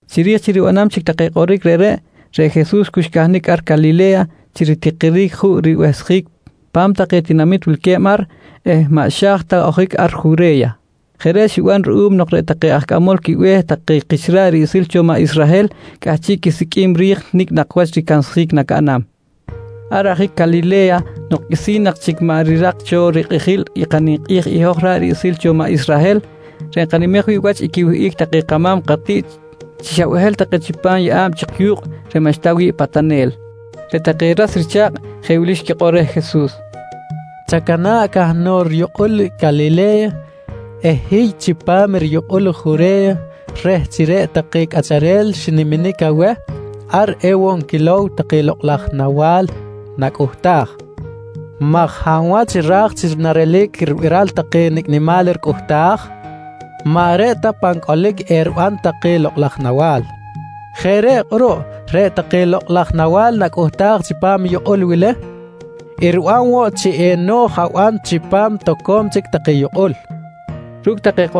Chiri̱j chi ribanam chic take kꞌoric reꞌreꞌ, reꞌ Jesus cu xcahnic ar Calile̱ya chi ritikiric juꞌ ribehsjic pa̱m take tinamit wilque̱b ar eh maꞌ xa̱j ta ojic ar Jure̱ya. Jeꞌ reꞌ xiban ruꞌum nok reꞌ take aj cꞌamol quibe̱h take kich ra̱ꞌ riꞌsil cho maꞌ Israhel cꞌahchiꞌ quisiqꞌuim ri̱j nicꞌ nak wach ricansjic nacaꞌnam. Ar ajic Calile̱ya nok qꞌuisi̱n nak chic maꞌ rirak cho rikꞌijil i kaninkꞌi̱j i hoj ra̱ꞌ riꞌsil cho maꞌ Israhel reꞌ nkanimej wi̱ꞌ wach i quiwihꞌic take kama̱m katiꞌt chi xa behel take chipam yeꞌa̱b chik yu̱kꞌ reꞌ maꞌxta wi̱ꞌ patanel, reꞌ take ras richa̱kꞌ jeꞌ wili xquikꞌor reh Jesus: «Chacana̱ꞌ cahnok riyukꞌul Calile̱ya eh hiy chipam riyukꞌul i Jure̱ya reh chi reꞌ take cꞌacharel xiniminic aweh ar ewoꞌ nquilow take lokꞌ laj nawa̱l nacꞌuhtaj maj hab wach ra̱j chi narelic ribiral take nicꞌ nimal ricꞌuhtaj, maꞌ reꞌ ta pan cꞌolic eriban take lokꞌ laj nawa̱l. Jeꞌ reꞌ kꞌuruꞌ reꞌ take lokꞌ laj nawa̱l nacꞌuhtaj chipam i yukꞌul wili riban woꞌ chi eno̱j aban chipam toco̱m chic take yukꞌul, nqui take reh.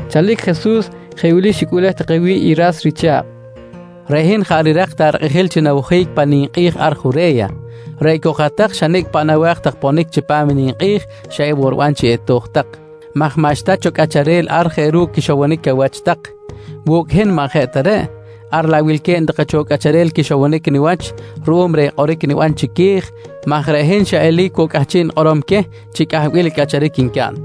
Chalic Jesus jeꞌ wili xicꞌuꞌlej take wi̱ꞌ i ras richa̱kꞌ: «Reꞌ hin jaꞌ rirak ta rikꞌijil chi nawojic pan ninkꞌi̱j ar Jure̱ya, reꞌ cok i hat-tak xa nicꞌ paꞌ nawa̱j tak ponic chipam i ninkꞌi̱j xa ewoꞌ riban chi eto̱j tak maj maꞌxta cho cꞌacharel ar je ru̱cꞌ quixowonic awach tak. Wu̱cꞌ hin maꞌ jeꞌ ta reꞌ, ar laꞌ wilque̱b take cho cꞌacharel quixowonic niwach ruꞌum reh kꞌoric niban chiqui̱j maj reꞌ hin xa eli̱c woꞌ cꞌahchiꞌ nikꞌorom queh chi cꞌahbil i cꞌacharic ncaꞌn.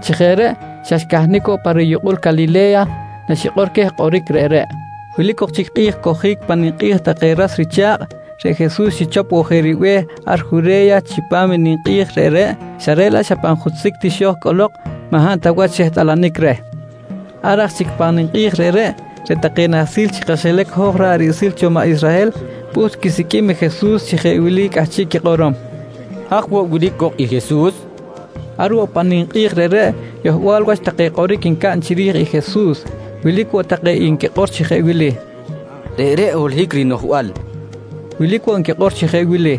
Chi jeꞌ reꞌ xa xcahnic woꞌ pa riyukꞌul Calile̱ya naxikꞌor queh kꞌoric reꞌreꞌ. Wilic ok chic kꞌi̱j cojic pan ninkꞌi̱j take ras richa̱kꞌ, reꞌ Jesus xichop woꞌ je ribe̱h ar Jure̱ya chipam i ninkꞌi̱j reꞌreꞌ xa reꞌ laꞌ xa pan jutzic ti xo̱j cꞌolok, maꞌ hab ta wach xehtꞌalanic reh. Ar aj chic pan ninkꞌi̱j reꞌreꞌ, reꞌ take nahsil chi kaxilac hoj ra̱ꞌ riꞌsil cho maꞌ Israhel pꞌuht quisiqꞌuim i Jesus chi jeꞌ wili cꞌahchiꞌ quikꞌorom: «Haj woꞌ wilic cok i Jesus? nqui nquikꞌor chi quiwach. Ar woꞌ pan ninkꞌi̱j reꞌreꞌ yohbal wach take kꞌoric ncaꞌn chiri̱j i Jesus. Wilic woꞌ take nquikꞌor chi jeꞌ wili: «Reꞌreꞌ holohic rinoꞌjbal, nqui take. Wilic woꞌ nquikꞌor chi jeꞌ wili: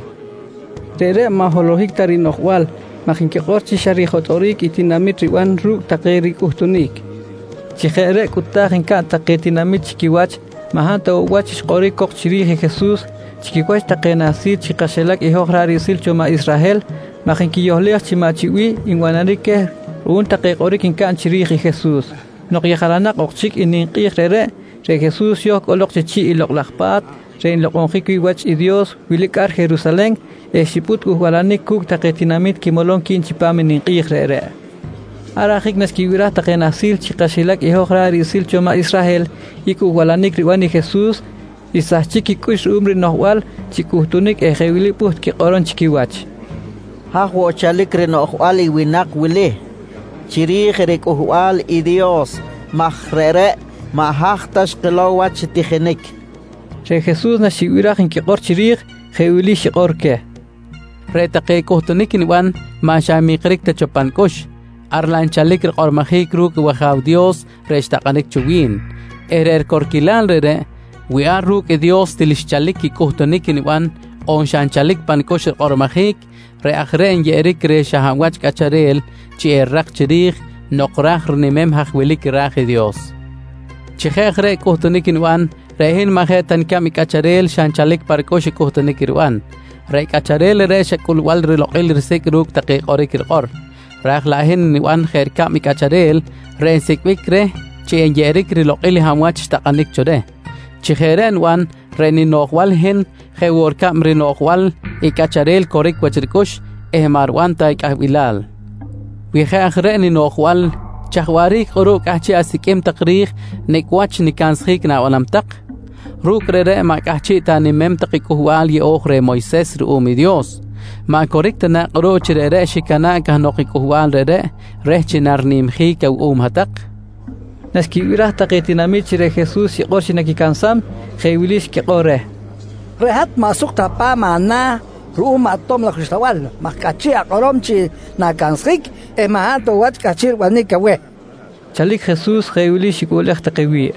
«Reꞌreꞌ maꞌ holohic ta rinoꞌjbal maj nquikꞌor chi xa rijotꞌoric i tinamit riban ru̱cꞌ take ricꞌuhtunic, nqui take. Chi jeꞌ reꞌ cꞌuta̱j ncaꞌn take tinamit chi quiwach maꞌ hab ta woꞌ wach xkꞌoric cok chiri̱j i Jesus chi quiwach take nahsil chi kaxilac i hoj ra̱ꞌ riꞌsil cho maꞌ Israhel maj nquiyohlej chi maꞌ chi bih nbanaric queh ruꞌum take kꞌoric ncaꞌn chiri̱j i Jesus. Nok yejalanak ok chic i ninkꞌi̱j reꞌreꞌ, reꞌ Jesus xo̱j cꞌolok chi chi̱ꞌ i Lokꞌ laj Pa̱t reꞌ nlokꞌonjic wi̱ꞌ wach i Dios wilic ar Jerusalen eh xipꞌut cꞌuhbalanic cu̱cꞌ take tinamit quimolom qui̱b chipam i ninkꞌi̱j reꞌreꞌ. Ar ajic naxquibiraj take nahsil chi kaxilac i hoj ra̱ꞌ riꞌsil cho maꞌ Israhel i cꞌuhbalanic riban i Jesus, xsahchic quicꞌux ruꞌum rinoꞌjbal chi cꞌuhtunic eh jeꞌ wili pꞌuht quikꞌorom chi quiwach: «Haj woꞌ nchalic rinoꞌjbal i winak wili chiri̱j riCꞌuhbal i Dios maj reꞌreꞌ maꞌ haj ta xkilow wach chi tijinic? nqui take. Reꞌ Jesus naxibiraj nquikꞌor chiri̱j, jeꞌ wili xikꞌor queh: «Reꞌ take cꞌuhtunic niban, maꞌ xa nmikric ta cho pa nicꞌux, ar laꞌ xchalic rikꞌormojic ru̱cꞌ i wAja̱w Dios reꞌ xtakꞌanic cho wi̱n eh reꞌ ricorquilal reꞌreꞌ, wi ar ru̱cꞌ i Dios til xchalic i cꞌuhtunic niban on xa nchalic pa nicꞌux rikꞌormojic reꞌ aj reꞌ nyeꞌeric reh xa hab wach cꞌacharel chi erirak chiri̱j nok raj rinimem haj wilic ra̱j i Dios. «Chi je aj reꞌ cꞌuhtunic niban, reꞌ hin maꞌ jeꞌ ta nicab i cꞌacharel xa nchalic pa ricꞌux i cꞌuhtunic riban. Reꞌ cꞌacharel reꞌreꞌ xa cꞌulbal rilokꞌil risi̱c ru̱cꞌ take kꞌoric rikꞌor. Ra̱j laꞌ hin niban jeꞌ ricab i cꞌacharel reꞌ nsicꞌbic reh chi enyeꞌeric rilokꞌil reꞌ hab wach xtakꞌanic cho reh. Chi jeꞌ reꞌ niban, reꞌ ninoꞌjbal i hin jeꞌ woꞌ ricab rinoꞌjbal i cꞌacharel coric wach ricꞌux eh maꞌ riban ta i cꞌahbilal. Wi jeꞌ aj reꞌ ninoꞌjbal chaj waꞌric kꞌuruꞌ cꞌahchiꞌ asiqꞌuim tak ri̱j nicꞌ wach nicansjic na̱banam tak? Ru̱cꞌ reꞌreꞌ maꞌ cꞌahchiꞌ ta animem tak i Cꞌuhbal yeꞌo̱j reh Moyses ruꞌum i Dios. Maꞌ coric ta na kꞌuruꞌ chi reꞌreꞌ xicana̱ꞌ cahnok i cꞌuhbal reꞌreꞌ reh chi narinimjic awuꞌum tak? nqui Jesus queh. Naxquibiraj take tinamit chi reꞌ Jesus xikꞌor chi naquicansam, jeꞌ wili xquikꞌor reh: «Reꞌ hat maꞌ suk ta pa̱m ana̱ ruꞌum i maꞌ tob laj uxlabal maj cꞌahchiꞌ akꞌorom chi na̱cansjic eh maꞌ hab ta woꞌ wach cꞌahchiꞌ ribanic aweh, nqui tak reh. Chalic Jesus jeꞌ wili xicꞌuꞌlej take wi̱ꞌ: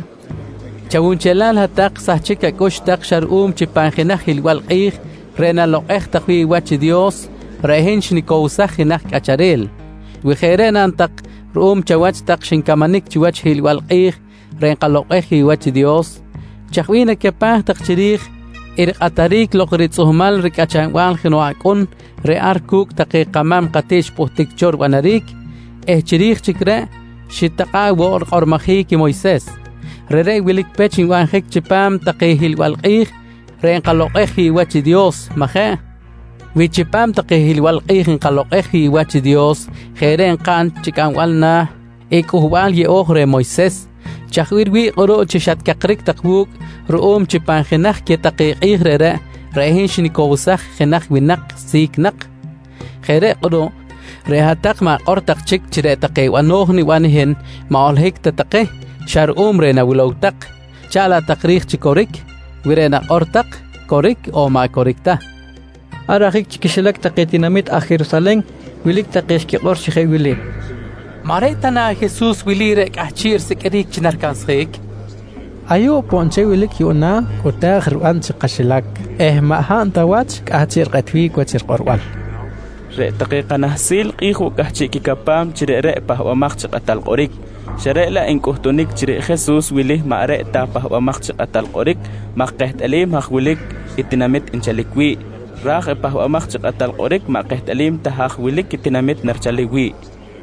«Chawunchelal hat-tak sahchic acꞌux tak xa ruꞌum chi pan jenaj hiꞌlbal kꞌi̱j reꞌ nalokꞌej tak wi̱ꞌ wach i Dios reꞌ hin xnicowsaj jenaj cꞌacharel. Wi jeꞌ reꞌ naꞌn tak ruꞌum chi chawach tak xincamanic chiwach i hiꞌlbal kꞌi̱j reꞌ nkalokꞌej wi̱ꞌ wach i Dios, chaj bih nacapaj tak chiri̱j i rikꞌataric lok ritzꞌuhmal ricꞌachanbal jenoꞌ acꞌun reꞌ ar cu̱cꞌ take kama̱m katiꞌt xpꞌuhtic cho ribanaric eh chiri̱j chic reꞌ xitakꞌa̱ꞌ woꞌ rikꞌormojic i Moyses? Reꞌreꞌ wilic pech nbanjic chipam take hiꞌlbal kꞌi̱j reꞌ nkalokꞌej wi̱ꞌ wach i Dios, majeꞌ? Wi chipam take hiꞌlbal kꞌi̱j nkalokꞌej wi̱ꞌ wach i Dios jeꞌ reꞌ nkaꞌn chi cꞌambal na̱ i Cꞌuhbal Yeꞌo̱j reh Moyses, chaj bih riwi̱ꞌ kꞌuruꞌ chi xatcakric tak wu̱cꞌ ruꞌum chi pan jenaj queh take kꞌi̱j reꞌreꞌ, reꞌ hin xnicowsaj i jenaj winak si̱c nak? Jeꞌ reꞌ kꞌuruꞌ reꞌ hat-tak ma̱kꞌor tak chic chi reꞌ take bano̱j niban i hin maꞌ holohic ta take xa ruꞌum reh nawilow tak chaꞌn laꞌ tak ri̱j chi coric wi reꞌ nakꞌor tak coric on maꞌ coric ta, nqui Jesus. Ar ajic chi quixilac take tinamit aj Jerusalen wilic take xquikꞌor chi jeꞌ wili: «Maꞌ reꞌ ta na i Jesus wili reꞌ cꞌahchiꞌ risiqꞌuiric chi naricansjic? Ayuꞌ poꞌ nchel wilic yuꞌna, cꞌuta̱j riban chi kaxilac eh maꞌ hab ta wach cꞌahchiꞌ rikꞌetbic wach rikꞌorbal. Reꞌ take kanahsil kꞌi̱j woꞌ cꞌahchiꞌ quicapam chi reꞌreꞌ i Pahbamaj chi Kꞌatal Kꞌoric, xa reꞌ laꞌ ncꞌutunic chi reꞌ Jesus wili maꞌ reꞌ ta i Pahbamaj chi Kꞌatal Kꞌoric maj kehtꞌalim haj wilic tinamit nchalic wi̱ꞌ. Ra̱j i Pahbamaj chi Kꞌatal Kꞌoric maꞌ kehtꞌalim ta haj wilic tinamit narichalic wi̱ꞌ, nqui xquikꞌor.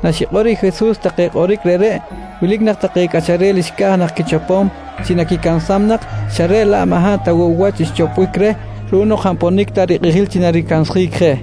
Naxikꞌor i Jesus take kꞌoric reꞌreꞌ wilic take cꞌacharel xca̱j nak quichopom chi naquicansam nak, xa reꞌ laꞌ maꞌ hab ta woꞌ wach xchopbic reh ruꞌum nok jaꞌ nponic ta rikꞌijil chi naricansjic je.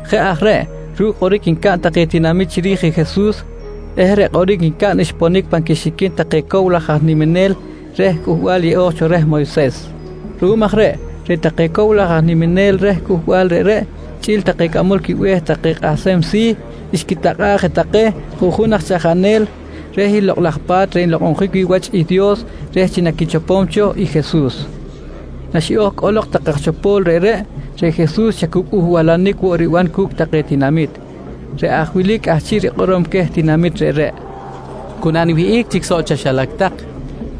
Jeꞌ aj reꞌ ruꞌ kꞌoric ncaꞌn take tinamit chiri̱j i Jesus eh reꞌ kꞌoric ncaꞌn xponic pan quixiquin take cow laj aj niminel reh Cꞌuhbal Yeꞌo̱j reh Moyses. Ruꞌum aj reꞌ, reꞌ take cow laj aj niminel reh cꞌuhbal reꞌreꞌ chꞌi̱l take cꞌamol quibe̱h take aj kꞌahsem si̱, xquitakꞌa̱ꞌ je take juꞌjun aj chaꞌjanel reh i Lokꞌ laj Pa̱t reꞌ nlokꞌonjic wi̱ꞌ wach i Dios reh chi naquichopom cho i Jesus. Naxiꞌo̱j cꞌolok take aj chopo̱l reꞌreꞌ, reꞌ Jesus xa cu cꞌuhbalanic woꞌ riban cu̱cꞌ take tinamit. Reꞌ aj wili cꞌahchiꞌ rikꞌorom queh tinamit reꞌreꞌ: «Cu naniwihꞌic chic soꞌ chaxilac tak,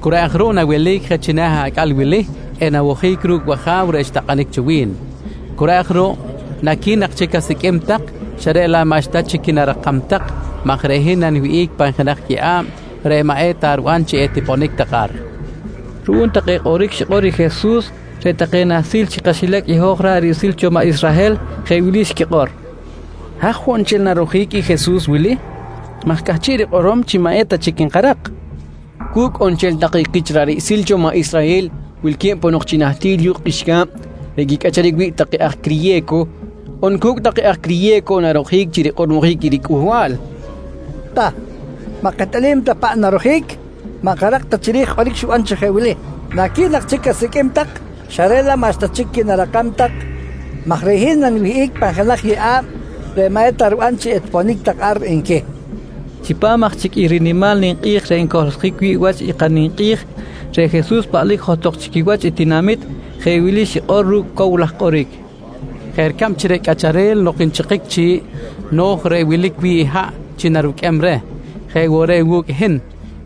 cu reꞌ aj ruꞌ nawelic je china̱ acꞌal wili eh nawojic ru̱cꞌ i wAja̱w reꞌ xtakꞌanic cho wi̱n. Cu reꞌ aj ruꞌ naqui̱n nak chic asiqꞌuim tak xa reꞌ laꞌ maꞌxta chic qui̱narakam tak maj reꞌ hin naniwihꞌic pan jenaj yeꞌa̱b reꞌ maꞌ eta riban chi etiponic tak ar, nqui Jesus queh. Ruꞌum take kꞌoric xikꞌor i Jesus reꞌ take nahsil chi kaxilac i hoj ra̱ꞌ riꞌsil cho maꞌ Israhel jeꞌ wili xquikꞌor: «Haj woꞌ nchel narojic i Jesus wili maj cꞌahchiꞌ rikꞌorom chi maꞌ eta chic nkarak? Cu̱cꞌ on nchel take kich ra̱ꞌ riꞌsil cho maꞌ Israhel wilque̱b ponok chi nahtil yu̱kꞌ qꞌuixca̱b reꞌ quicꞌacharic wi̱ꞌ take aj criye̱co on cu̱cꞌ take aj criye̱co narojic chi rikꞌormojic i ricꞌuhbal? Ta, maꞌ kehtꞌalim ta paꞌ narojic, maꞌ nkarak ta chiri̱j i kꞌoric xiban chi jeꞌ wili: ‹Naqui̱n nak chic asiqꞌuim tak xa reꞌ laꞌ maꞌxta chic qui̱narakam tak maj reꞌ hin naniwihꞌic pan jenaj yeꞌa̱b reꞌ maꞌ eta riban chi etiponic tak ar nqui, nqui xquikꞌor. Chipam aj chic i rinimal kꞌi̱j reꞌ ncohlsjic wi̱ꞌ wach i kaninkꞌi̱j, reꞌ Jesus paꞌlic johtok chi quiwach i tinamit jeꞌ wili xikꞌor ru̱cꞌ cow laj kꞌoric: «Jeꞌ ricab chi reꞌ cꞌacharel nok nchikic chi̱ꞌ, no̱j reꞌ wilic wi̱ꞌ i haꞌ chi naruqꞌuem reh, je woꞌ reꞌ wu̱cꞌ i hin,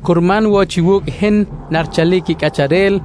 curman woꞌ chi wu̱cꞌ i hin narichalic i cꞌacharel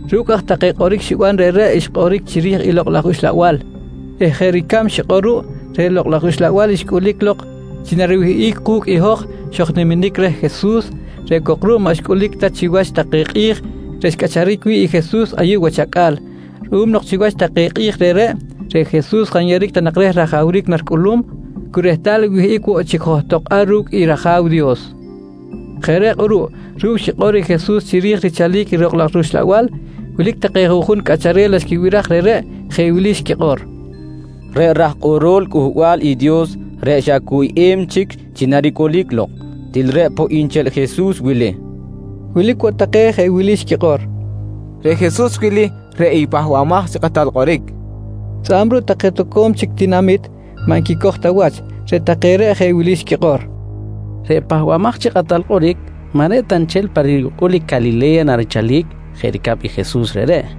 Ru̱cꞌ aj take kꞌoric xiban reꞌreꞌ xkꞌoric chiri̱j i Lokꞌ laj Uxlabal eh jeꞌ ricab xikꞌor ruꞌ, reꞌ Lokꞌ laj Uxlabal xcꞌulic lok chi nariwihꞌic ku̱cꞌ i hoj xojniminic reh Jesus reꞌ cok ruꞌ maꞌ xcꞌulic ta chiwach take kꞌi̱j reꞌ xcꞌacharic wi̱ꞌ i Jesus ayuꞌ wach acꞌal ruꞌum nok chiwach take kꞌi̱j reꞌreꞌ, reꞌ Jesus jaꞌ nyeꞌeric ta nak reh i rajawric naricꞌulum cu rehtal nwihꞌic woꞌ chic johtok ar ru̱cꞌ i rAja̱w Dios. Jeꞌ reꞌ kꞌuruꞌ ru̱cꞌ xikꞌor i Jesus chiri̱j richalic i Lokꞌ laj rUxlabal, wilic take juꞌjun cꞌacharel naxquibiraj reꞌreꞌ, jeꞌ wili xquikꞌor: «Reꞌ raj kꞌorol Cꞌuhbal i Dios reꞌ xa cuyꞌem chic chi naricꞌulic lok, til reꞌ poꞌ nchel i Jesus wili, nqui take. Wilic woꞌ take jeꞌ wili xquikꞌor: «Reꞌ Jesus wili, reꞌ i Pahbamaj chi Kꞌatal Kꞌoric, nqui xquikꞌor. Tzꞌa̱b ruꞌ take toco̱m chic tinamit, maꞌ nquicoj ta wach. Reꞌ take reꞌ jeꞌ wili xquikꞌor: «Reꞌ Pahbamaj chi Kꞌatal Kꞌoric maꞌ reꞌ ta nchel pa riyukꞌul Calile̱ya narichalic jeꞌ ricab i Jesus reꞌreꞌ.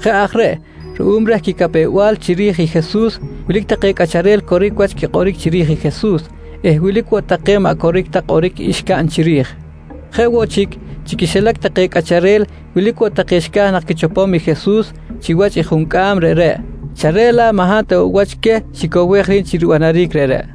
Jeꞌ aj reꞌ ruꞌum reh quicapew-bal chiri̱j i Jesus, wilic take cꞌacharel coric wach quikꞌoric chiri̱j i Jesus eh wilic woꞌ take maꞌ coric ta kꞌoric xcaꞌn chiri̱j. Jeꞌ woꞌ chic, chi quixilac take cꞌacharel wilic woꞌ take xca̱j nak quichopom i Jesus chiwach i juncꞌam reꞌreꞌ, xa reꞌ laꞌ maꞌ hab ta woꞌ wach queh xicowej ri̱b chi ribanaric reꞌreꞌ.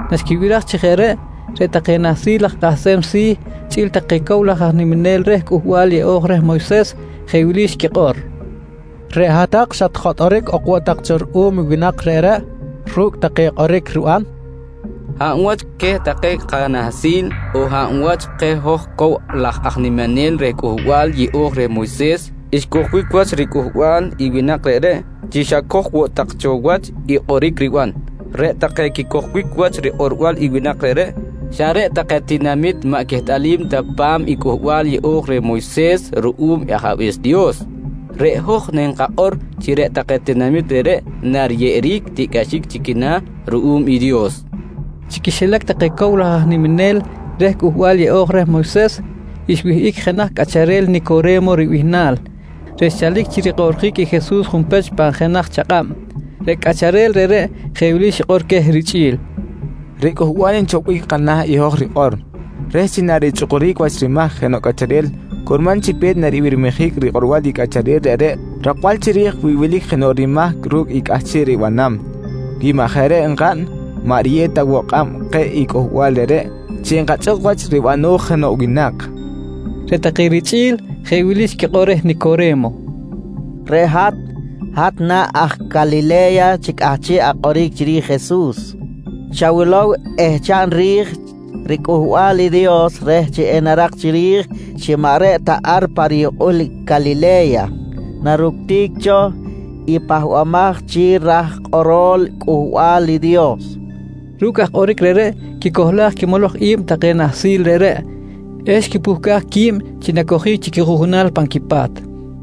Naxquibiraj chi jeꞌ reꞌ, reꞌ take nahsil aj kꞌahsem si̱ chꞌi̱l take cow laj aj niminel reh Cꞌuhbal Yeꞌo̱j reh Moyses jeꞌ wili xquikꞌor: «Reꞌ hat-tak xatjotꞌoric ok woꞌ tak cho ruꞌum i winak reꞌreꞌ ru̱cꞌ take kꞌoric riban? Hab wach queh take kanahsil on hab wach keh hoj cow laj aj niminel reh Cꞌuhbal Yeꞌo̱j reh Moyses, xcojbic wach ricꞌuhbal i winak reꞌreꞌ chi xacoj woꞌ tak cho wach i kꞌoric riban? Reꞌ take quicojbic wach rikꞌorbal i winak reꞌreꞌ, xa reꞌ take tinamit maꞌ quehtꞌalim ta pa̱m i Cꞌuhbal yeꞌo̱j reh Moyses ruꞌum i Ajabe̱s i Dios. Reꞌ hoj nkakꞌor chi reꞌ take tinamit reꞌreꞌ nariyeꞌeric tiꞌcꞌaxic chi quina̱ ruꞌum i Dios, nqui take. Chi quixilac take cow laj aj niminel reh Cꞌuhbal Yeꞌo̱j reh Moyses, xwihꞌic jenaj cꞌacharel Nicore̱mo ribihnal reꞌ xchalic chi rikꞌoꞌrjic i Jesus junpech pan jenaj chakꞌab. Reꞌ cꞌacharel reꞌreꞌ jeꞌ wili xikꞌor queh richꞌi̱l: «Reꞌ Cꞌuhbal nchopbic kana̱ i hoj rikꞌor, reh chi narichꞌukuric wach rimahc jenoꞌ cꞌacharel curman chi pe̱t naribirmijic rikꞌorbal i cꞌacharel reꞌreꞌ rakbal chiri̱j wi wilic jenoꞌ rimahc ru̱cꞌ i cꞌahchiꞌ ribanam. Wi maꞌ jeꞌ reꞌ enkaꞌn, maꞌ riyew ta woꞌ kꞌab keh i cꞌuhbal reꞌreꞌ chi enkachꞌuk wach ribano̱j jenoꞌ winak, nqui queh. Reꞌ take richꞌi̱l jeꞌ wili xquikꞌor reh Nicore̱mo: «Reꞌ hat, hat na aj Calile̱ya chi cꞌahchiꞌ akꞌoric chiri̱j i Jesus? Chawilow eh chaꞌn ri̱j riCꞌuhbal i Dios reh chi enarak chiri̱j chi maꞌ reꞌ ta ar pa riyukꞌul Calile̱ya naructic cho i pahbamaj chi raj kꞌorol Cꞌuhbal i Dios, nqui take reh. Ru̱cꞌ aj kꞌoric reꞌreꞌ quicohlaj quimoloj i̱b take nahsil reꞌreꞌ eh xquipuhcaj qui̱b chi nacojic chi quijuꞌjunal pan quipa̱t.